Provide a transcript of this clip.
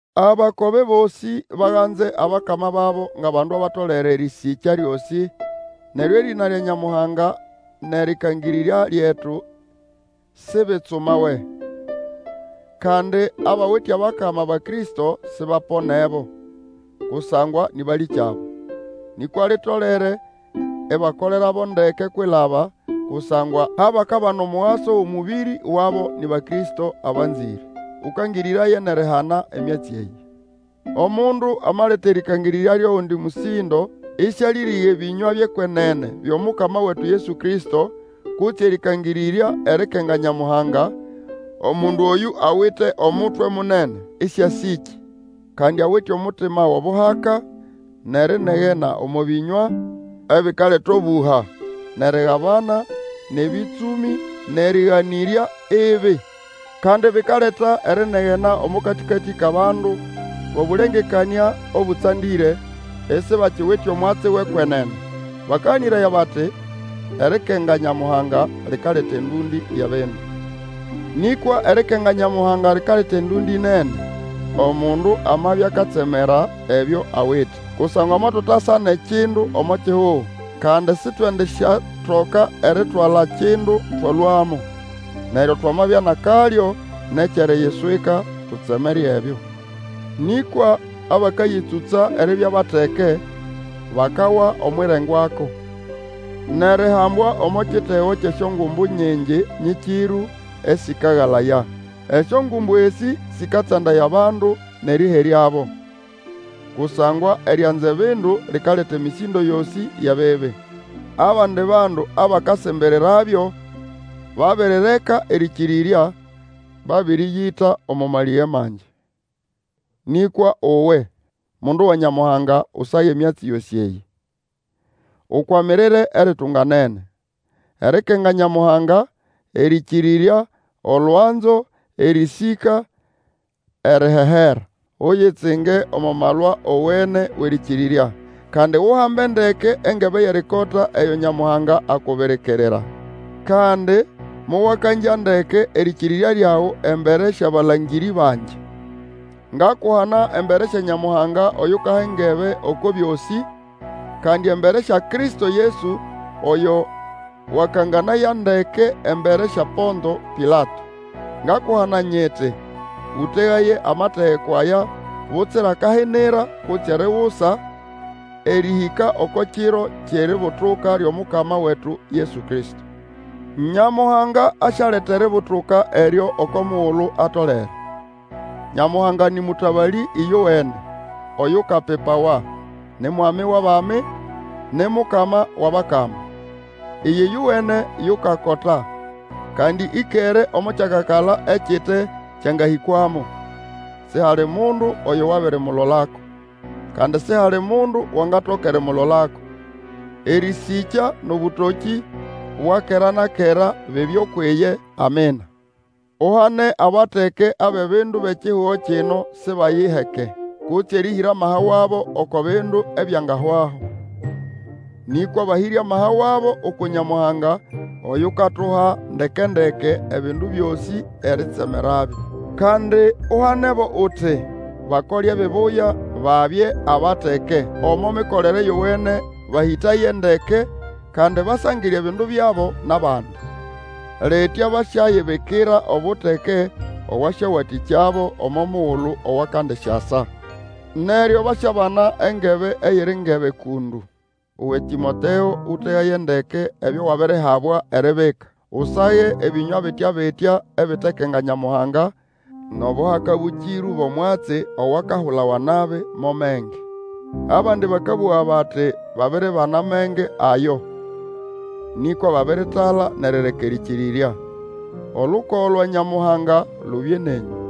Abakobe bosĩ baganze abakama babo ngʼabandu batolere erĩsĩkya lyosĩ, neryo erĩna lya Nyamuhanga nʼerĩkangĩrĩrya lyetu sibitsumawe. Kandi abawite abakama Bakristo sibaponebo, kusangwa nĩ balĩkyabo. Nĩkwa, litolere ibakolerabo ndeke kwilaba, kusangwa abakabana omugaso wʼomũbĩrĩ wabo ni Bakristo abanzĩre. Erĩkangĩrĩrya lyʼamabehĩ nʼobuteke bwʼekwenene Ũkangĩrĩraye nʼerihana emyatsi eyĩ. Omundu amaleta erĩkangĩrĩrya lyʼogundi mũsĩndo, ĩsĩalĩrĩga ebĩnywa byʼekwenene byʼomukama wetu Yesu Kristo, kutse erĩkangĩrĩrya erĩkakenga Nyamuhanga, omundu oyũ awite omutwe munene, ĩsĩasĩkĩ. Kandi awite omutima wʼobuhaka, nʼerinegena omo bĩnywa, ebikaleta obũha, nʼerigabana, nʼebĩtsũmĩ, nʼerĩganĩrya ibi. Kandi bikaleta erinegena omo katĩkatĩ kʼabandu bʼobũlengekanĩa obũtsandĩre, isibakiwite omwatsi wʼekwenene. Bakaganĩraya bati, erikenga Nyamuhanga likaleta endũndĩ yʼebindu. Nĩkwa erikenga Nyamuhanga likaleta endũndĩ nene, omundu amabya akatsemera ebyo awite. Kusangwa motutasa nʼekindu omo kihugo, kandi sitwendisyatoka eritwala kindu, twalũamo. Neryo twamabya nʼakalyo nʼekyʼeriyiswika, tutsemere ebyo. Nĩkwa abakayĩtsũtsa eribya bateke bakawa omwʼirengwako, nʼerihambwa omo kitego kyʼesyongumbu nyingi nyĩkĩrũ, esĩkagalaya. Esyongumbu esĩ sĩkatsandaya bandu nʼerĩheryabo. Kusangwa erianza ebindu likaleta emĩsĩndo yosĩ yʼebibi. Abandi bandu abakasimbirirabyo babirireka erĩkĩrĩrya, babĩrĩyita omo malĩge mangi. Nĩkwa uwe, mundu wa Nyamuhanga, Usage emyatsi yosĩ eyĩ, ukwamirire eritunganene, erikenga Nyamuhanga, erĩkĩrĩrya, olwanzo, erĩsĩka, erihehera. Uyitsinge omo malwa owene wʼerĩkĩrĩrya, kandi uhambe ndeke engebe yʼerikota eyo Nyamuhanga akubirikirira. Kandi mowakangya ndeke erĩkĩrĩrya lyawe embere syʼabalangĩrĩ bangi. Ngakuhana embere sya Nyamuhanga, oyukaha engebe oko byosĩ, kandi embere sya Kristo Yesu, oyo wakanganaya ndeke embere sya Ponto Pilato. Ngakuhana nyiti, ũtegaye amategeko aya butsira kahinira kutse erigusa, erĩhĩka oko Kiro kyʼeributuka lyʼomukama wetu Yesu Kristo. Nyamuhanga asyaleta eributuka eryo oko mugulu atolere. Nyamuhanga nĩ mũtabalĩ ĩyowene, oyukapipawa, ni Mwami wʼabami, ni Mukama wʼabakama. Iye ĩyowene yukakota; kandi ĩkere omo kyakakala ekite kyangahĩkwamo. Sihali mundu oyo wabirimulolako, kandi sihali mundu wangatoka erimulolako. Erĩsĩkya nʼobũtokĩ bwa kera na kera bibye ukwʼiye, Amina. Uhane abateke abʼebindu bʼekihugo kino sibayiheke, kutse erĩhĩra amaha wabo oko bindu ebyangahwaho. Nĩkwa bahĩre amaha wabo uku Nyamuhanga oyukatuha ndeke-ndeke ebindu byosĩ eritsemerabyo. Kandi uhanebo uti, bakole ebibuya, babye abateke omo mikolere yowene bahĩtaye ndeke, kandi basangire ebindu byabo nʼabandi. Litya basyayibikira obuteke obwasyawatĩkyabo omo mugulu owakandisyasa. Neryo basyabana engebe eyiri ngebe kũndũ. Uwe Tĩmoteo, ũtegaye ndeke ebyo wabirihabwa eribika. Usage ebĩnywa bitya-bitya ebitekenga Nyamuhanga nʼobuhaka bũkĩrũ bʼomwatsi owakahulawa nabi mo menge. Abandi bakabũga bati babiribana amenge ayo, nĩkwa babiritala nʼerireka erĩkĩrĩrya. Olukogo lwa Nyamuhanga lubye nenyũ.